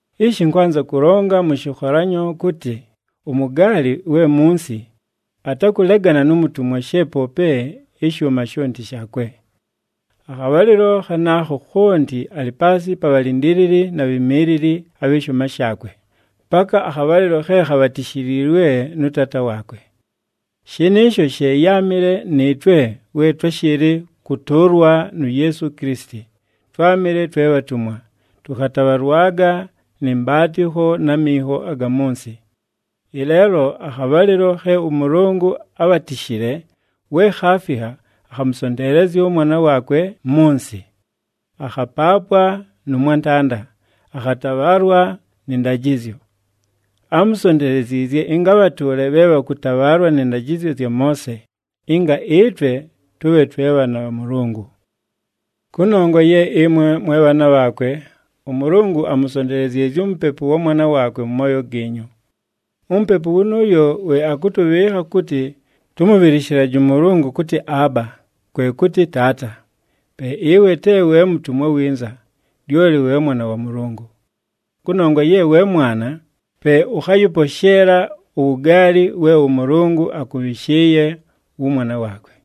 Ishi ɨnkwanza kʉlonga mʉ shɨkholanyo kʉtɨ, umugaali we munsi, atakʉlegana nu mutumwa she poope ɨshʉʉma shonti shaakwe. Akhabhalɨlo khanaakho khonti alɨ paasɨ pa bhalindiilili na bhimiilili abhɨ shʉʉma shaakwe, paka akhabhalɨlo khe khabhatishiilwe nʉ taata waakwe. Shɨnɨɨsho she yáamɨle nɨɨtwe we twáshɨɨlɨ kʉtʉʉlwa nu Yeesu Kilisiti, twámɨle twe bhatumwa, tʉkhatabhalwaga nɨ mbaatɨkho na minho aga mʉ nsɨ. Ɨleelo akhabhalɨlo khe ʉMʉlʉngʉ ábhatishile we khaafikha, akhamʉsonteelezya ʉMwana waakwe mʉ nsɨ. Akhapaapwa nʉ mwantanda, akhatabhaalwa nɨ ndajɨzyo. Ámusonteleziizye ɨnga abhatʉʉle bhe bhakhatabhalwaga nɨ ndajɨzyo zya Moose, ɨnga ɨtwe tʉbhe twe bhaana bha Mʉlʉngʉ. Kʉnongwa ye ɨmwe mwe bhaana bhaakwe, ʉMʉlʉngʉ amusonteleziizye uMupepu wa Mwana waakwe mʉ mooyo giinyu. UMupepu wʉnʉʉyo we akʉtʉbhɨɨkha kʉtɨ tʉmʉbhɨlɨshɨlaje ʉMʉlʉngʉ kʉtɨ, “Aaba,” kwe kʉtɨ, “Taata.” Pe ɨwe te we mutumwa winza, lyoli we mwana wa Mʉlʉngʉ. Kʉnongwa ye we mwana, pe ʉkhayɨposheela uwugaali we ʉMʉlʉngʉ akʉbhɨshɨɨye wʉmwana waakwe.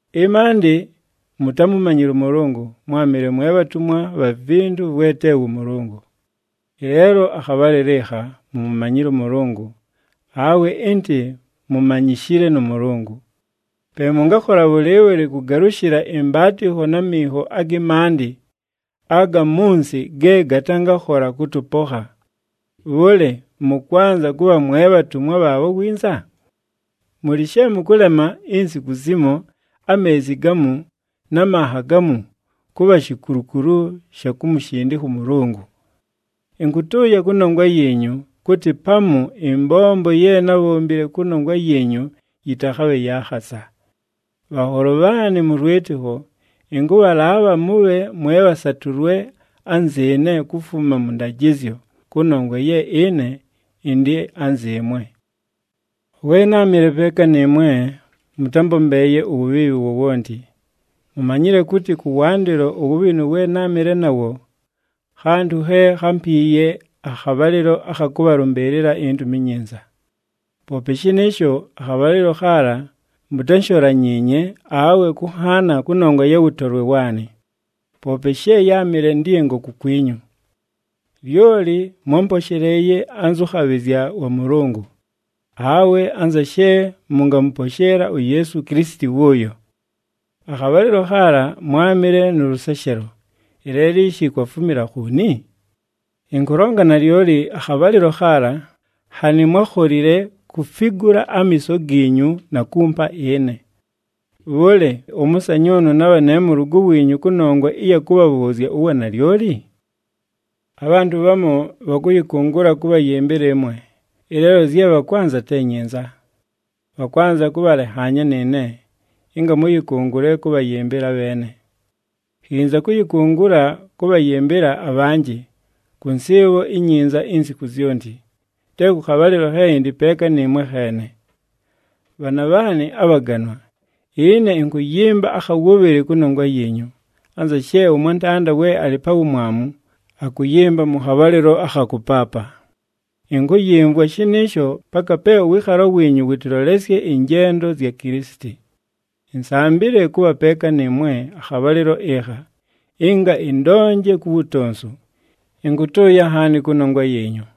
Ɨmaandɨ mutámumanyile ʉMʉlʉngʉ, mwámɨle mwe bhatumwa bha vintu vwe te wʉ Mʉlʉngʉ. Ɨleelo akhabhalɨlo ɨkha, mumumanyile ʉMʉlʉngʉ, awe ɨntɨ mumanyishile nʉ Mʉlʉngʉ. Pe mʉngakhola bhʉlɨɨbhʉlɨ kʉgalʉshɨla ɨmbaatɨkho na minho agɨ maandɨ aga mʉ nsɨ ge gatangakhola kʉtʉpokha. Bhʉlɨ, mʉkwanza kʉbha mwe bhatumwa bhaabho winza? Mʉlɨ she mʉkʉlema insiku zimo, ameezi gamu na manha gamu kʉbha shikulukulu sha kumushindikha ʉMʉlʉngʉ! Ɨnkʉtʉʉya kʉnongwa yiinyu kʉtɨ pamu ɨmbombo ye nábhombile kʉnongwa yiinyu yɨtakhabhe ya khasa! Bhanholo bhaanɨ mʉ lwɨtɨkho, ɨnkʉbhalaabha mʉbhe mwe bhasatʉlwe anzɨɨne kufuma mʉ ndajɨzyo, kʉnongwa ye ɨne ɨndɨ anzɨɨmwe. We náamɨle peeka nɨɨmwe, mʉtámbombeeye uwubhiibhi wowonti. Mumanyile kʉtɨ kʉwandɨlo uwubhinu we náamɨle nawo, khantʉ khe khámpiiye akhabhalɨlo akha kʉbhalʉmbɨɨlɨla iNtumi iNyinza. Poope shɨnɨɨsho, akhabhalɨlo khaala mutánsholanyiinye awe kʉnhaana kʉnongwa ya wʉtolwe waanɨ, poope she yáamɨle ndɨngo kukwinyu. Lyoli mwámposheleeye anzʉ khabhɨzya wa Mʉlʉngʉ, awe anza she mʉngamʉposheela uYeesu Kilisiti wʉʉyo. Akhabhalɨlo khaala mwámɨle nʉ lʉseshelo, ɨleelo ishi kwafumila khooni? Ɨnkʉlonga nalyoli, akhabhalɨlo khaala nhanɨ mwákholile kufigula amiiso giinyu na kumpa ɨne. Bhʉlɨ, ʉmʉsanyʉʉnʉ nabha ne mʉlʉgʉ wiinyu kʉnongwa ɨya kʉbhabhʉʉzya uwanalyoli? Abhantʉ bhamu bhakʉyɨkʉngʉla kʉbhayɨmbɨla ɨmwe, ɨleelo zye bhakwanza te nyinza. Bhakwanza kʉbhalenhaanya nɨɨne, ɨnga mʉyɨkʉngʉle kʉbhayɨmbɨla abheene. Khinza kʉyɨkʉngʉla kʉbhayɨmbɨla abhanjɨ kʉ nsɨɨbho inyinza insiku zyonti, te kʉ khabhalɨlo khe ɨndɨ peeka nɨɨmwe kheene. Bhaana bhaanɨ abhaganwa, ɨne ɨnkʉyɨmba akha wʉbhɨlɨ kʉnongwa yiinyu, anza she ʉmwantanda we alɨ pa wumwamu, akʉyɨmba mʉ khabhalɨlo akha kʉpaapa. Ɨnkʉyɨmvwa shɨnɨɨsho paka pe ʉwɨɨkhalo wiinyu wʉtɨlolesye ɨnjendo zya Kilisiti. Insambile kʉbha peeka nɨɨmwe akhabhalɨlo ɨkha, ɨnga ɨndonje ku wutonsu! Ɨnkʉtʉʉya nhaani kʉnongwa yiinyu!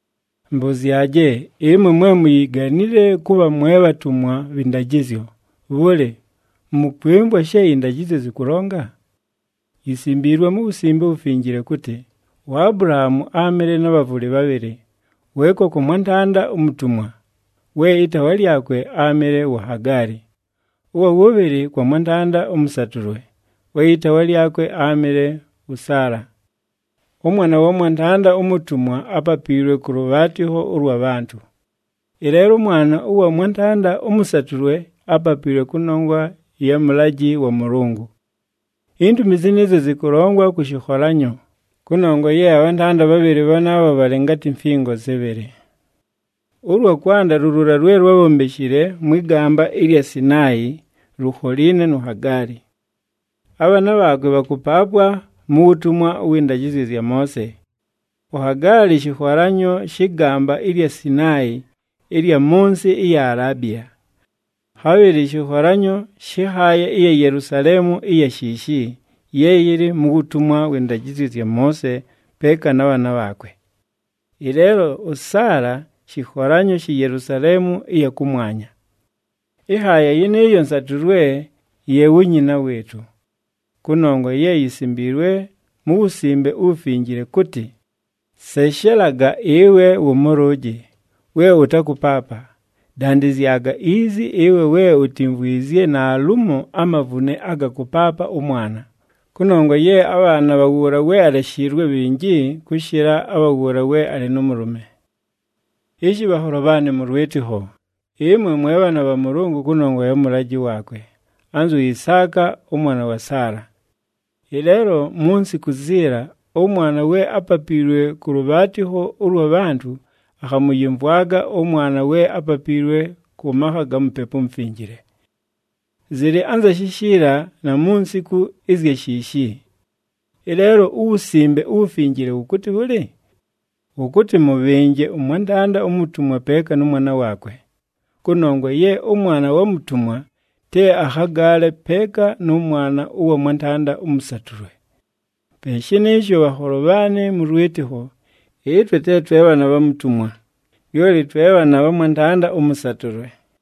Mbʉzyaje, ɨmwe mwe muyiganile kʉbha mwe bhatumwa bhɨ ndajɨzyo, bhʉlɨ, mʉkwɨmvwa she ɨndajɨzyo zɨkʉlonga? Yisimbiilwe mu Wusimbe uWufinjile kʉtɨ, uAbulahaamu áamɨle na bhavʉlɨ bhabhɨlɨ, weeka kwa mwantanda umutumwa, we ɨtaawa lyakwe áamɨle wu Hagaali, ʉwa wʉbhɨlɨ kwa mwantanda ʉmʉsatʉlwe, we ɨtaawa lyakwe áamɨle wʉ Saala. ɄMwana wa mwantanda umutumwa ápapiilwe kʉ lʉbhaatɨkho ʉlwa bhantʉ. Ɨleelo ʉmwana ʉwa mwantanda ʉmʉsatʉlwe ápapiilwe kʉnongwa ya mʉlajɨ wa Mʉlʉngʉ. Intumi zɨnɨɨzyo zɨkʉlongwa kʉ shɨkholanyo, kʉnongwa ye abhantanda bhabhɨlɨ bhanaabho bhalɨ ngatɨ mfingo zɨbhɨlɨ. Ʉlwa kwanda lu luula lwe lwábhombeshile mwɨ gamba ɨlya Sinaayi, lukholiine nu Hagaali. Abhaana bhaakwe bhakʉpaapwa mu wutumwa wɨ ndajɨzyo zya Moose. UHagaali shɨkholanyo shɨ gamba ɨlya Sinaayi ɨlya mʉ nsɨ ɨya Alaabiya. Khabhɨlɨ shɨkholanyo shɨ nhaaya ɨya Yelusaleemu ɨya shiishi, ye yɨlɨ mu wutumwa wɨ ndajɨzyo zya Moose peeka na bhaana bhaakwe. Ɨleelo ʉSaala, shɨkholanyo shi Yelusaleemu ɨya kʉmwanya. Ɨnhaaya yɨnɨɨyo nsatʉlwe, ye wu nyina wɨɨtʉ. Kʉnongwa ye yisimbiilwe mu Wusimbe uWufinjile, kʉtɨ, “Seshelaga ɨwe wʉmʉlʉʉjɨ, we ʉtakʉpaapa, dandɨzyaga izi ɨwe we utimvwizye naalumo amavune aga kʉpaapa ʉmwana, kʉnongwa ye abhaana bha wʉʉla we aleshiilwe bhinji, kʉshɨla abha wʉʉla we alɨ nʉ mʉlʉme.” Ishi bhanholo bhaanɨ mʉ lwɨtɨkho, ɨmwe mwe bhaana bha Mʉlʉngʉ kʉnongwa ya mʉlajɨ waakwe, anzu Isaaka ʉmwana wa Saala. Ɨleelo mu nsiku ziila, ʉmwana we ápapiilwe kʉ lʉbhaatɨkho ʉlwa bhantʉ, akhamʉyɨmvwaga ʉmwana we ápapiilwe kʉ makha ga Mupepu uMufinjile. Zɨlɨ anza shishiila na mu nsiku ɨzya shiishi. Ɨleelo uWusimbe uWufinjile wʉkʉtɨ bhʉlɨ? Wʉkʉtɨ, “Mʉbhɨnje ʉmwantanda umutumwa peeka nʉ mwana waakwe, kʉnongwa ye ʉmwana wa mutumwa, te akhagaale peeka nʉ mwana ʉwa mwantanda ʉmʉsatʉlwe.” Pe shɨnɨɨsho bhanholo bhaanɨ mʉ lwɨtɨkho, ɨtwe te twe bhaana bha mutumwa, lyoli twe bhaana bha mwantanda ʉmʉsatʉlwe.